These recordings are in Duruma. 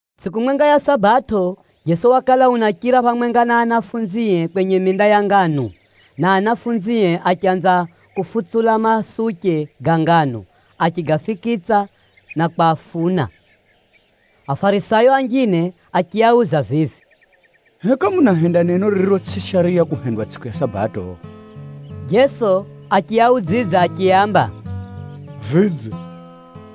Tsʼiku mwenga ya Sabato, Jeso wakala unachira phamwenga na anafunzie kwenye minda ya nganu, na ao anafunzie achanza kufutsula masuche ga nganu achigafikitsa na kwafuna. Afarisayo anjine achiauza vivi, “Heka munahenda neno ririro tsʼi shariya kuhendwa tsʼiku ya Sabato?” Jeso achiaudzidza achiaamba, “Vidze,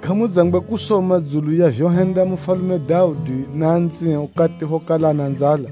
kʼamudzangwe kusoma dzulu ya vyohenda mufalume Daudi na anzie ukati phokala ana nzala?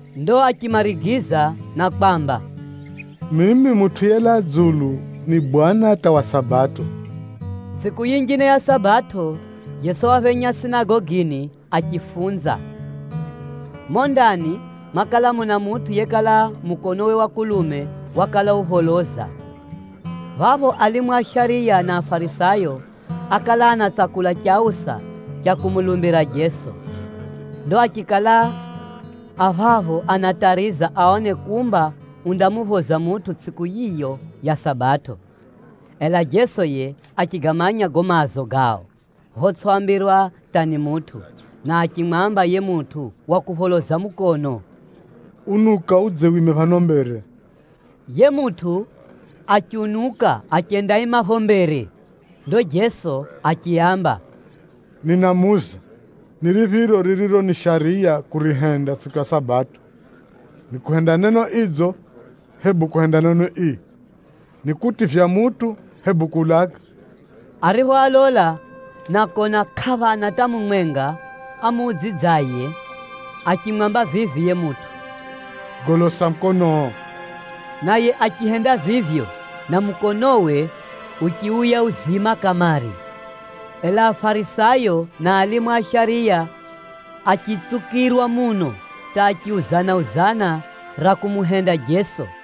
Ndo achimarigiza na kwamba, “Mimi Mutʼu yelaa dzulu ni Bwana hata wa Sabato.” Tsʼiku yinjine ya Sabato, Jeso waphenya sinagogini achifunza. Mumo ndani mwakala muna mutʼu yekala mukonowe wa kulume wakala upholoza. Phapho alimu a shariya na Afarisayo ákala anatsakula chausa cha kumulumbira Jeso. Ndo achikala a phapho anatariza aone kumba undamuphoza mutʼu tsʼiku yiyo ya Sabato. Ela Jeso yiye achigamanya gago maazo gao photsʼiambirwa hata ni mutʼu, na achimwamba yiye mutʼu wa kupholoza mukono, “Unuka udze wime phano mbere.” Yiye mutʼu achiunuka achendaima phapho mbere. Ndo Jeso achiaamba, “Ninamuuza, ni riphiro ririro ni shariya kurihenda tsʼiku ya Sabato, ni kuhenda neno idzo, hebu kuhenda neno ii, ni kutivya mutʼu, hebu kuulaga?” Ariphoalola na kona kʼaphana hata mumwenga amuudzidzaye, achimwamba vivi yiye mutʼu, “Golosa mukonoo.” Naye achihenda vivyo, na mukonowe uchiuya uzima kamare. Ela Afarisayo na alimu a shariya achitsukirwa muno hata achiuzana-uzana ra kumuhenda Jeso.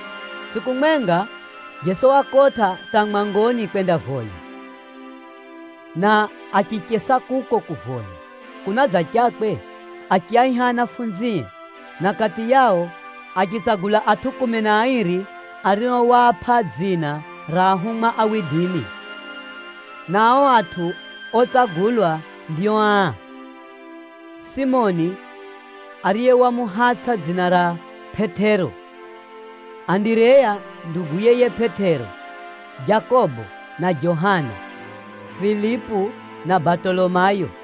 Tsʼiku mwenga, Jeso wakotʼa mwangoni kwendavoya, na achichesa kuko kumuvoya Mulungu. Kunadzachakwe achiaiha anafunzie, na kati yao achitsagula atʼu kumi na airi ario waapʼa dzina ra ahumwa. Na ao atʼu otsagulwa ndio aa: Simoni (ariye wamuhatsʼa dzina ra Pʼetero), Andireya nduguye yiye Pʼetero, Jakobo na Johana, Filipu na Batolomayo,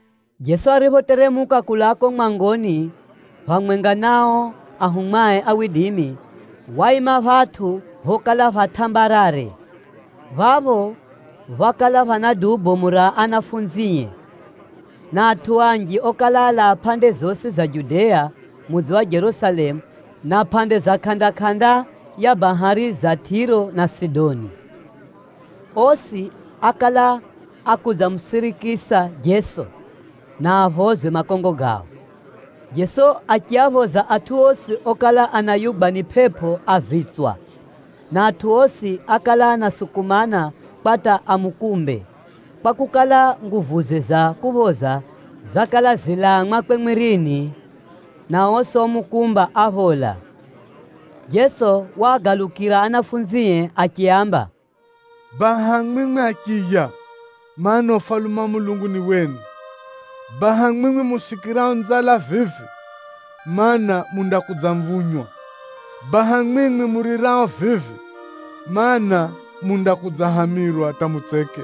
Jeso ariphoteremuka kulaa kuko mwangoni phamwenga na ao anafunzie, waima phatʼu phokala pha tʼambarare. Phapho phákala phana duu bomu ra anafunzie, na atʼu anji okala alaa pʼande zosi za Judea, mudzi wa Jerusalemu na pʼande za kʼanda-kʼanda ya bahari za Tʼiro na Sidoni. Osi ákala ákudzamusirikisa Jeso, na aphozwe makongo gao. Jeso achiaphoza atʼu osi okala anayugwa ni pʼepʼo a vitswa. Na atʼu osi ákala anasukumana kwa hata amukumbe, kwakukala, nguvuze za kuphoza zakala zilaa mwakwe mwirini, na osi omukumba, áphola. Jeso waagalukira anafunzie achiaamba, “Baha mwimwi achiya, mana, Ufalume wa Mulungu ni wenu. Baha mwimwi musikirao nzala vivi, mana, mundakudzamvunywa. Baha mwimwi murirao vivi, mana, mundakudzahamirwa hata mutseke.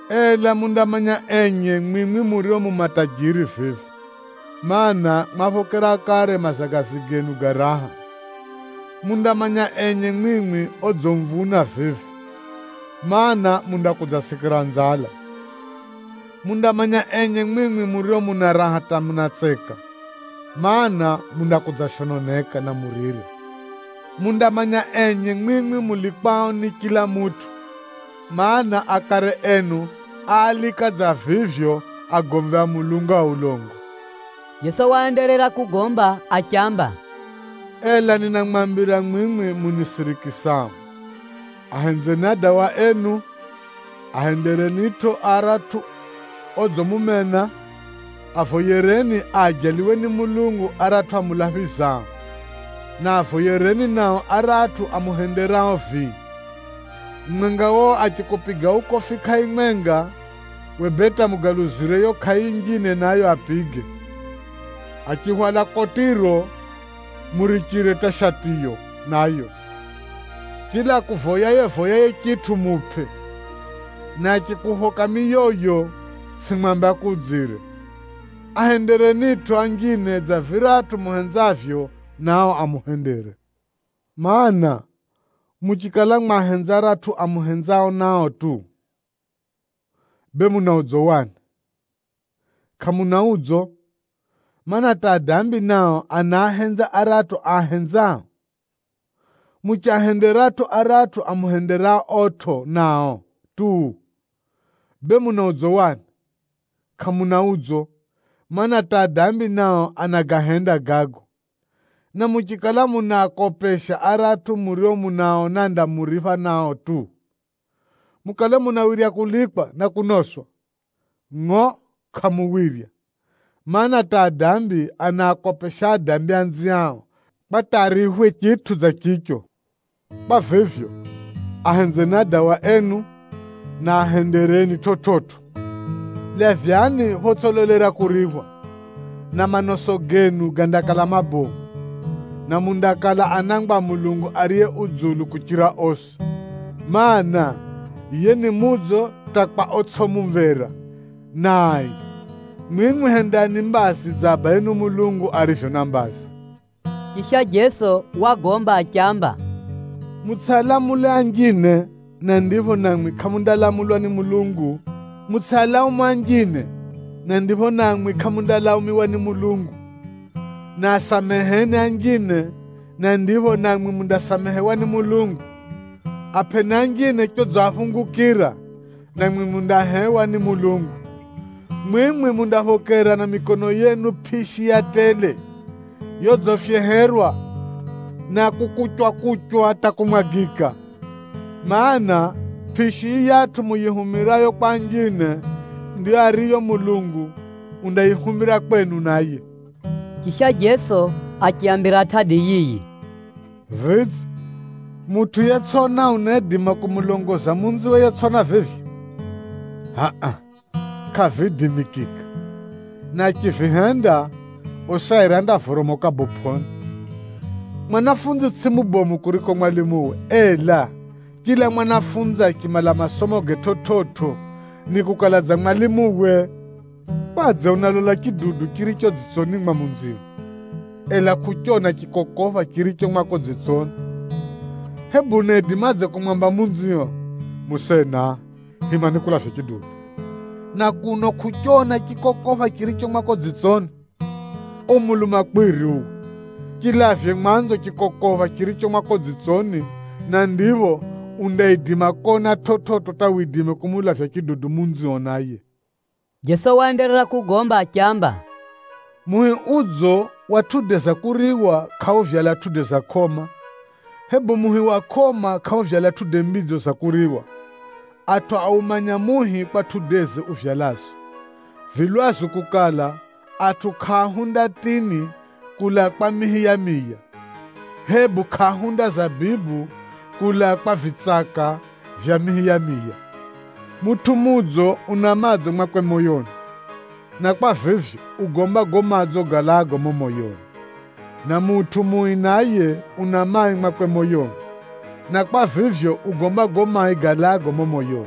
“Ela mundamanya enye mwimwi murio mu matajiri vivi, mana, mwaphokera kare mazagazi genu ga raha. Mundamanya enye mwimwi odzimvuna vivi, mana, mundakudzasikira nzala. Mundamanya enye mwimwi murio muna raha hata munatseka, mana, mundakudzashononeka na murire. “Mundamanya enye mwimwi mulikwao ni chila mutʼu, mana, akare enu áalika dza vivyo agomvi a Mulungu a ulongo.” Jeso waenderera kugomba achiamba, “Ela ninamwambira mwimwi munisirikisao, ahenzeni adawa enu, ahenderenitʼo aratʼu odzimumena, avoyereni aajaliwe ni Mulungu aratʼu amulaphizao, na avoyereni nao aratʼu amuhenderao vii. Mumwenga wao achikupiga ukofi kʼai mwenga, uwe bee hata mugaluzire yiyo kʼai yinjine nayo apige. Achihwala kotiro, murichire hata shatiyo nayo. Chila akuvoyaye-voyaye chitʼu, mupʼe, na achikuphoka miyoyo, tsʼimwambe akuudzire. Ahenderenitʼo anjine dza viratʼu muhenzavyo nao amuhendere. “Maana, muchikala mwahenza aratʼu amuhenzao nao tu, bee muna udzo wani? Kʼamuna udzo, mana, hata adambi nao anaahenza aratʼu aahenzao. Muchiahenderatʼo aratʼu amuhenderaotʼo nao tu, bee muna udzo wani? Kʼamuna udzo, mana, hata adambi nao anagahenda gago. Na muchikala munaakopesha aratʼu murio munaaona andamuripha nao tu, mukale munawirya kulikwa na kunoswa? Ngʼo kʼamuwirya, mana, hata adambi anaakopesha adambi anziao, kwa hata ariphwe chitʼu dza chicho! Kwa vivyo, ahenzeni adawa enu, na ahendereni chividzo. Lavyani photsʼilolera kuriphwa, na manoso genu gandakala mabomu, na mundakala anangwa a Mulungu Ariye Dzulu kuchira osi, mana, yiye ni mudzo hata kwa otsʼi mumvera, na ai. Mwimwi hendani mbazi dza Abayenu Mulungu arivyo na mbazi.” Chisha Jeso wagomba achiamba, “Mutsʼialamule anjine, na ndipho namwi kʼamundalamulwa ni Mulungu, mutsʼialaumu anjine, na ndipho namwi kʼamundalaumiwa ni Mulungu, na asameheni anjine, na ndipho namwi mundasamehewa ni Mulungu, apʼeni anjine chodziaphungukira, Na mwimwi mundahewa ni Mulungu. Mwimwi mundaphokera na mikono yenu pʼishi ya tele, yodzifyeherwa na kukuchwakuchwa hata kumwagika. Maana, pʼishi yiyatʼu muyihumirayo kwa anjine, ndiyo ariyo Mulungu undayihumira kwenu naye.” Chisha Jeso achiaambira tʼadi yiyi: “Vidze, mutʼu yetsʼona unaidima kumulongoza munziwe yetsʼona vivyo? Hʼa-a kʼaviidimikika, na achivihenda, osi airi andavoromoka bopʼoni. Mwanafunzi tsʼiye mubomu kuchira mwalimuwe, ela chila mwanafunzi achimala masomoge chividzo, nikukala dza mwalimuwe. Kwadze unalola chidudu chiricho dzitsoni mwa munzio, ela kʼuchona chikokopha chiricho mwako dzitsoni? Hebu unaidimadze kumwamba munzio, ‘Musena, hima nikulavye chidudu,’ na kuno kʼuchona chikokopha chiricho mwako dzitsoni? Uwe mulumakwiri uwe! Chilavye mwanzo chikokopha chiricho mwako dzitsoni, na ndipho undaidima kona chividzo hata widime kumulavya chidudu munzio naye.” Jeso waenderera kugomba achiamba, “Muhi udzo wa tʼude za kuriwa kʼauvyala matunda ga kʼoma, hebu muhi wa kʼoma kʼauvyala matunda madzo ga kuriwa. Atʼu aumanya muhi kwa tʼudeze uvyalazo. Vi lwazu kukala, atʼu kʼaahunda tʼini kulaa kwa mihi ya miya, hebu kʼaahunda zabibu kulaa kwa vitsaka vya mihi ya miya. Mutʼu mudzo, una madzo mwakwe moyoni, na kwa vivyo, ugomba gago madzo galaago mumo moyoni. Na mutʼu mui naye, una mai mwakwe moyoni, na kwa vivyo, ugomba gago mai galaago mumo moyoni.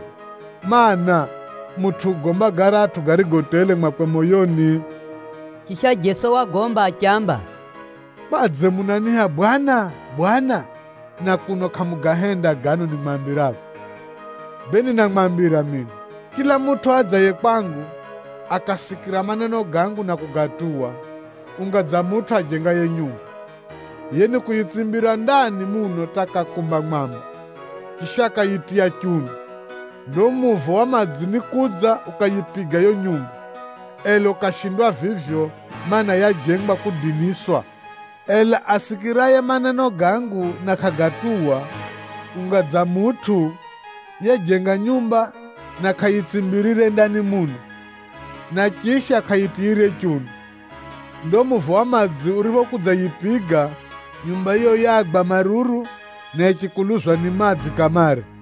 Maana, mutʼu ugomba garatʼu garigo tele mwakwe moyoni.” Chisha Jeso wagomba achiamba, “Kwadze munaniiha ‘Bwana, Bwana,’ na kuno kʼamugahenda gano nimwambirago? Bee ninamwambira mino, chila mutʼu adzaye kwangu, akasikira maneno gangu na kugatuwa, unga dza mutʼu ajengaye nyumba. Yiye nikuyitsimbira ndani muno hata akakumba mwamba, chisha akayitiya chunu. Ndo muvo wa madzi nikudza ukayipiga yiyo nyumba, ela ukashindwa vivyo, mana, yajengwa kudiniswa. Ela asikiraye maneno gangu na kʼagatuwa, unga dza mutʼu yejenga nyumba na kʼayitsimbirire ndani muno, na chisha kʼayitiyire chunu. Ndo muvo wa madzi uriphokudzayipiga, nyumba yiyo yagwa maruru, na yichikuluzwa ni madzi kamare!”